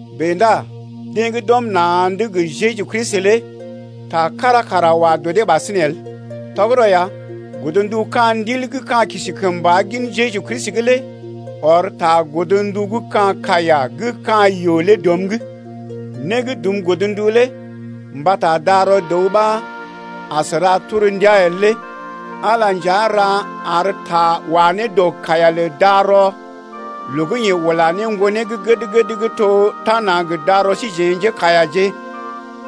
Bèe ndá deḛ gə́ d’ɔm na̰’d gə Jeju Kristi lé ta kára kara wa dɔ dee ɓasinè el. Tɔgərɔ ya, godndu ka̰ Ndil gə́ ka̰ kisi kəmba gin Jeju Kristi lé ɔr ta godndu gə́ ka̰ kaiya gə́ ka̰ yoo lé dɔm’g. Né gə́ dum godndu lé mbata darɔ dəw ɓa as ra torndia el lé Ala nja ra ar ta wa ne dɔ kaiya lə darɔ loo gə́ yeḛ ula ne Ŋgonee gə́ gəd-gəd gə́ to tana gə darɔ síjeḛ njékaiyaje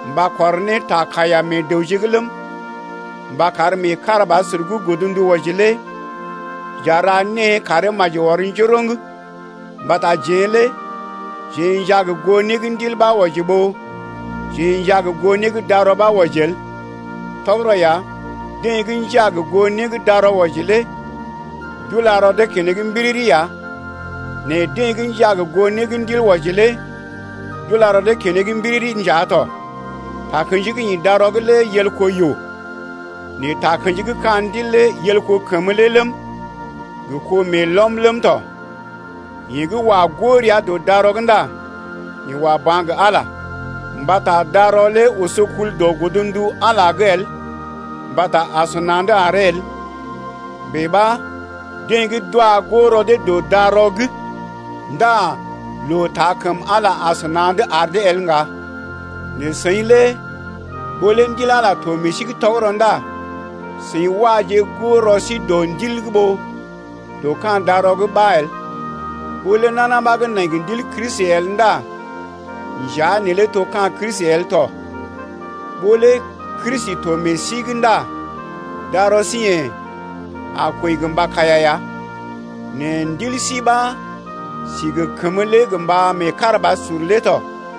mba kɔr ne ta kaiya meḛ dəwje’g ləm, mba kar meekarabasur gə́ godndu wɔji lé j’a ra née karee maji ɔr njoroŋ mbata jeḛ lé jeḛ njaa gə goo né gə́ Ndil ɓa wɔji ɓó jeḛ njaa gə goo né gə́ darɔ ɓa wɔji el. Tɔgərɔ ya, deḛ gə́ njaa gə goo né gə́ darɔ wɔji lé d’ula rɔ dee keneŋ mbiriri ya nɛ deḛ gə́ njaa gə goo né gə́ Ndil wɔji lé d’ula rɔ dee keneŋ mbiriri nja tɔ. Takə̰ji gə́ ḭ darɔ’g lé yel kó yoo, nɛ takə̰ji gə́ ka̰ Ndil lé yel kó kəmə lé ləm, gə kó meelɔm ləm tɔ. Yeḛ gə́ wa goo rəa dɔ darɔ’g ndá yeḛ wa ba̰ gə Ala, mbata darɔ lé oso kul dɔ godndu Ala’g lé el mbata asəna̰’d aree el. Bèe ɓa deḛ gə́ d’wa goo rɔ dee dɔ darɔ’g ndá loo taa kəm Ala asəna̰’d ar dee el ŋga. Nɛ seḭ lé ɓó lé Ndil Ala to meḛ sí’g tɔgərɔ ndá seḭ waje goo rɔ sí dɔ Ndil’g ɓó dɔ ka̰ darɔ’g ɓa el. Ɓó lé nana ɓa nai gə Ndil Kristi el ndá njea neelé to ka̰ Kristi el tɔ. Ɓó lé Kristi to meḛ sí’g ndá darɔ sí yḛ̀ a kwəi gə mba kaiya ya, nɛ ndil sí ɓa si gə kəmə lé gə mba meekarabasur lé tɔ.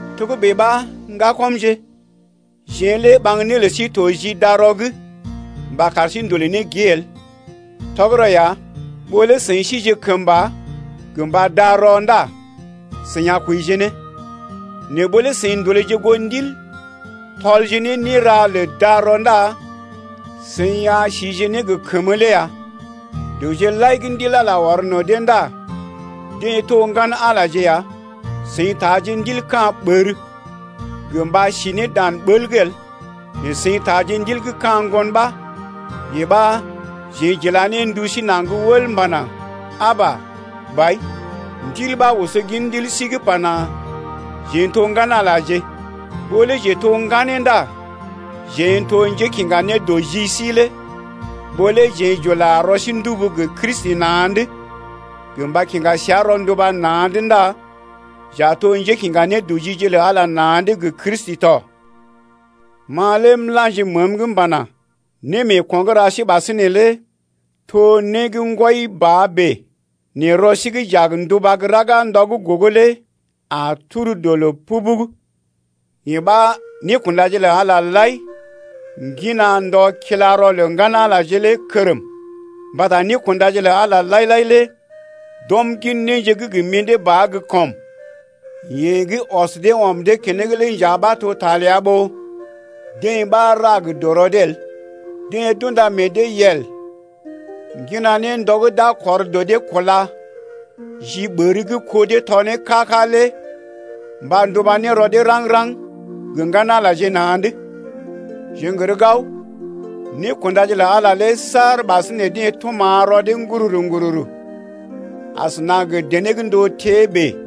Togə́bè ɓa, ŋgakɔmje, jeḛ lé ɓaŋg né lə sí to ji darɔ’g mba kar sí ndolè ne gée el. Tɔgərɔ ya, ɓó lé seḭ sije kəmba gə mba darɔ ndá seḭ a kwəije ne. Nɛ ɓó lé seḭ ndolèje goo Ndil, tɔlje ne néra lə darɔ ndá seḭ a sije ne gə kəmə lé ya. Dəwje lai gə́ Ndil Ala ɔr no̰ dee ndá deḛ to ŋgan-Alaje ya. Seḭ taaje ndil ka̰ ɓər gə mba si ne dan ɓəl’g el, nɛ seḭ taaje Ndil gə́ ka̰ ŋgon-ɓaa, yee ɓa jeḛ j’ila ne ndu sí naŋg wəl m’pana: Aba! Bai! Ndil ɓa oso gin ndil sí’g pana: Jeḛ n’to ŋgan-Alaje ya. Ɓó lé jeḛ n’to ŋganeeje ndá jeḛ n’to njékiŋga nédɔji síje lé. Ɓó lé jeḛ j’ula rɔ sí ndubu gə Kristi na̰’d gə mba kiŋga səa rɔnduba na̰’d ndá j’a to njékiŋga nédɔjije lə Ala na̰’d gə Kristi tɔ. Ma lé m’la̰ji məəm’g m’pana: Némeeko̰ gə́ ra sí ɓasinè lé to né gə́ ŋgwɔi ba bèe, nɛ rɔ sí gə́ j’a gə nduba gə́ raga ndɔ gə́ gogo lé a tur dɔ loo pubug. Yee ɓa nékundaje lə Ala lai ŋgina ndɔ kila rɔ lə ŋgan-Alaje lé kərm. Mbata nékundaje lə Ala lai-lai lé d’ɔm gin néje gə́ gə mḭdé ba gə́ kɔm. Yeḛ gə́ ɔs dee ɔm dee keneŋ lé nja ɓa to ta ləa ɓó deḛ ɓa ra gə dɔrɔ dee el. Deḛ d’unda meḛ dee yel ŋgina ne ndɔ gə́ d’a kɔr dɔ dee kúla ji ɓər gə́ kó dee tɔ ne ká-ká lé mba nduba ne rɔ dee raŋg-raŋg gə ŋgan-Alaje na̰’d. Jeḛ n’gər gao, nékundaje lə Ala lé saar ɓasinè deḛ tuma̰ rɔ dee ŋgururu-ŋgururu asəna gə dené gə́ ndóo tée bèe.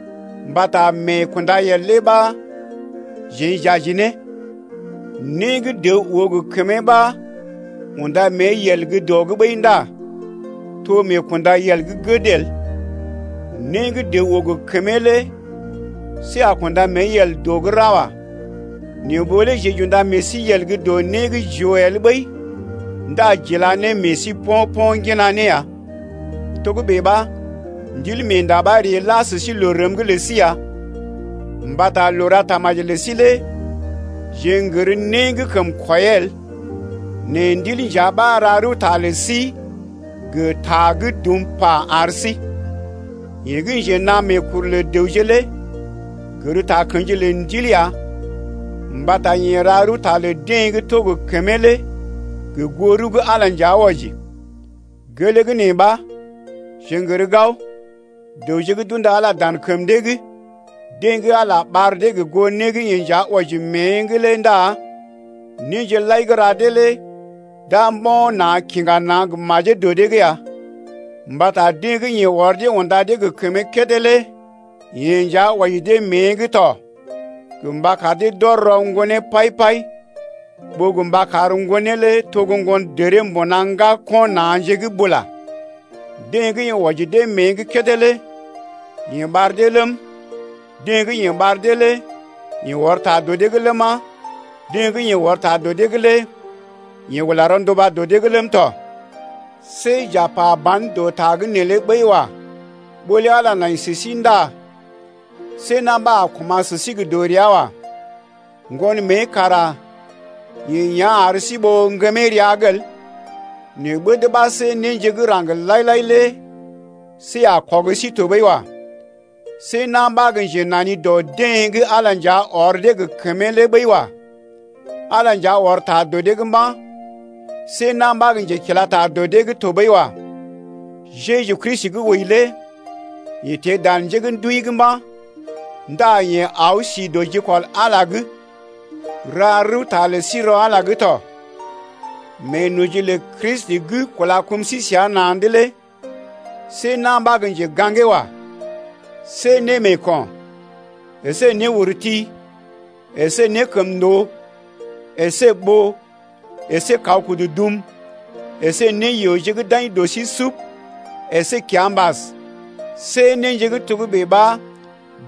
Mbata meekundayel lé ɓa jeḛ j’aji ne. Né gə́ dəw oo gə kəmee ɓa unda mée yel gə́ dɔ’g ɓəi ndá to meekundayel gə́ gəd el. Né gə́ dəw oo gə kəmee lé see a kunda mée yel dɔ’g ra wa. Nɛ ɓó lé jeḛ j’unda meḛ sí yel gə́ dɔ né gə́ jeḛ j’oo el ɓəi ndá j’ila ne meḛ sí po̰-po̰ ŋgina ne ya. Togə́bè ɓa Ndilmeenda ɓa ree la sə sí loo rəm’g lə sí ya mbata loo ra tamaji’g lə sí lé jeḛ n’gər né gə́ kəm kwɔiyee el. Nɛ Ndil nja ɓa ra rəwta lə sí gə ta gə́ dum pa ar sí. Yeḛ gə́ njenaa meekuru lə dəwje lé gər takə̰ji lə Ndil ya mbata yeḛ ra rəwta lə deḛ gə́ to gə kəmee lé gə goo rəw gə́ Ala nja wɔji. Gelee gə́ nee ɓa, jeḛ n’gər gao, dəwje gə́ d’unda Ala dan kəm dee’g, deḛ gə́ Ala ɓar dee gə goo né gə́ yeḛ nja wɔji mée’g lé ndá néje lai gə́ ra dee lé d’a mbo̰ na̰ kiŋga na̰ gə majee dɔ dee’g ya. Mbata deḛ gə́ yeḛ ɔr dee unda dee gə kəmee kédé lé yeḛ nja wɔji dee mée’g tɔ gə mba kar dee d’ɔr ne rɔ Ŋgonee pai-pai, ɓó gə mba kar Ŋgonee lé to gə́ ŋgondəree mbuna ŋgako̰ na̰je’g bula. Deḛ gə́ yeḛ wɔji dee mée’g kédé lé yeḛ ɓar dee ləm, deḛ gə́ yeḛ ɓar dee lé yeḛ ɔr ta dɔ dee’g ləma, deḛ gə́ yeḛ ɔr ta dɔ dee’g lé yeḛ ula rɔnduba dɔ dee’g ləm tɔ. See j’a pa ban dɔ ta’g neelé ɓəi wa. Ɓó lé Ala nai sə sí ndá see na̰ ɓa a koma̰ sə sí gə dɔrea wa. Ŋgon mée kara yeḛ yá̰ ar sí ɓó ŋgəmee rəa’g el, nɛ ɓəd ɓa see néje gə́ raŋg lai-lai lé see a kɔg sí tɔɓəi wa. See na̰ ɓa gə́ njenani dɔ deḛ gə́ Ala nja ɔr dee gə kəmee lé ɓəi wa. Ala nja ɔr ta dɔ dee’g mba̰. See na̰ ɓa gə́ njekila ta dɔ dee’g tɔɓəi wa. Jeju Kristi gə́ wəi lé yeḛ teḛ dan njé gə́ d’wəi’g mba̰ ndá yeḛ aw si dɔ jikɔl Ala’g lé ra rəwta lə sí rɔ Ala’g lé tɔ. Meenoji lə Kristi gə́ kúla kum sí səa na̰’d lé see na̰ ɓa gə́ njega̰gee wa. See némeeko̰, əsé néurti, əsé nékəmndoo, əsé ɓoo, əsé kaw kudu dum, əsé néyooje gə́ d’aḭ dɔ sí sub, əsé kiambas, see néje gə́ togə́bè ɓa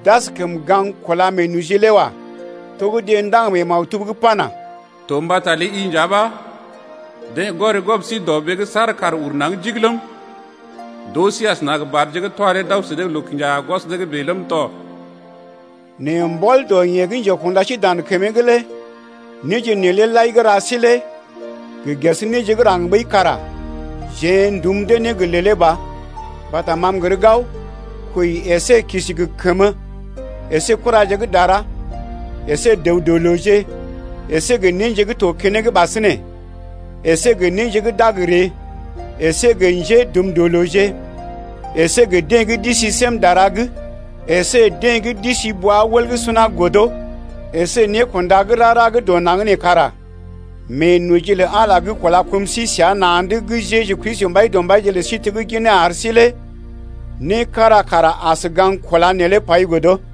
d’askəm gaŋg kúla meenoji lé wa. To gə́ deḛ ndaŋg mee maktub’g pana: To mbata ləi-i nja ɓa deḛ goré gwɔb sí dɔɓee’g saar kàr ur naŋg jig ləm, D’oo sí asəna gə badje gə́ twa dee d’aw sə dee gə́ loo-kinja-gwɔs dee’g bèe ləm tɔ. Nɛ mbɔl dɔ yeḛ gə́ njekunda sí dan kəmee’g lé néje neelé lai gə́ ra sí lé gə ges néje gə́ raŋg ɓəi kara jeḛ dum dee ne gə lèlé ba. Mbata ma m’gər gao, kwəi əsé kisi gə kəmə əsé kuraje gə́ dara, əsé dəw-dɔ-looje, əsé gə néje gə́ to keneŋ ɓasinè, əsé gə néje gə́ d’a gə ree, əsé gə njédumdɔlooje, əsé deḛ gə́ d’isi sém dara’g, əsé deḛ gə́ d’isi bwa-wəl gə́ suna godo, əsé nékunda gə́ rara gə́ dɔ naŋg nee, kara meenoji lə Ala gə́ kúla kum sí səa na̰’d gə Jeju Kristi Mbaidɔmbaije lə sí tegginee ar sí lé né kára kara as ga̰g kúla neelé pai godo.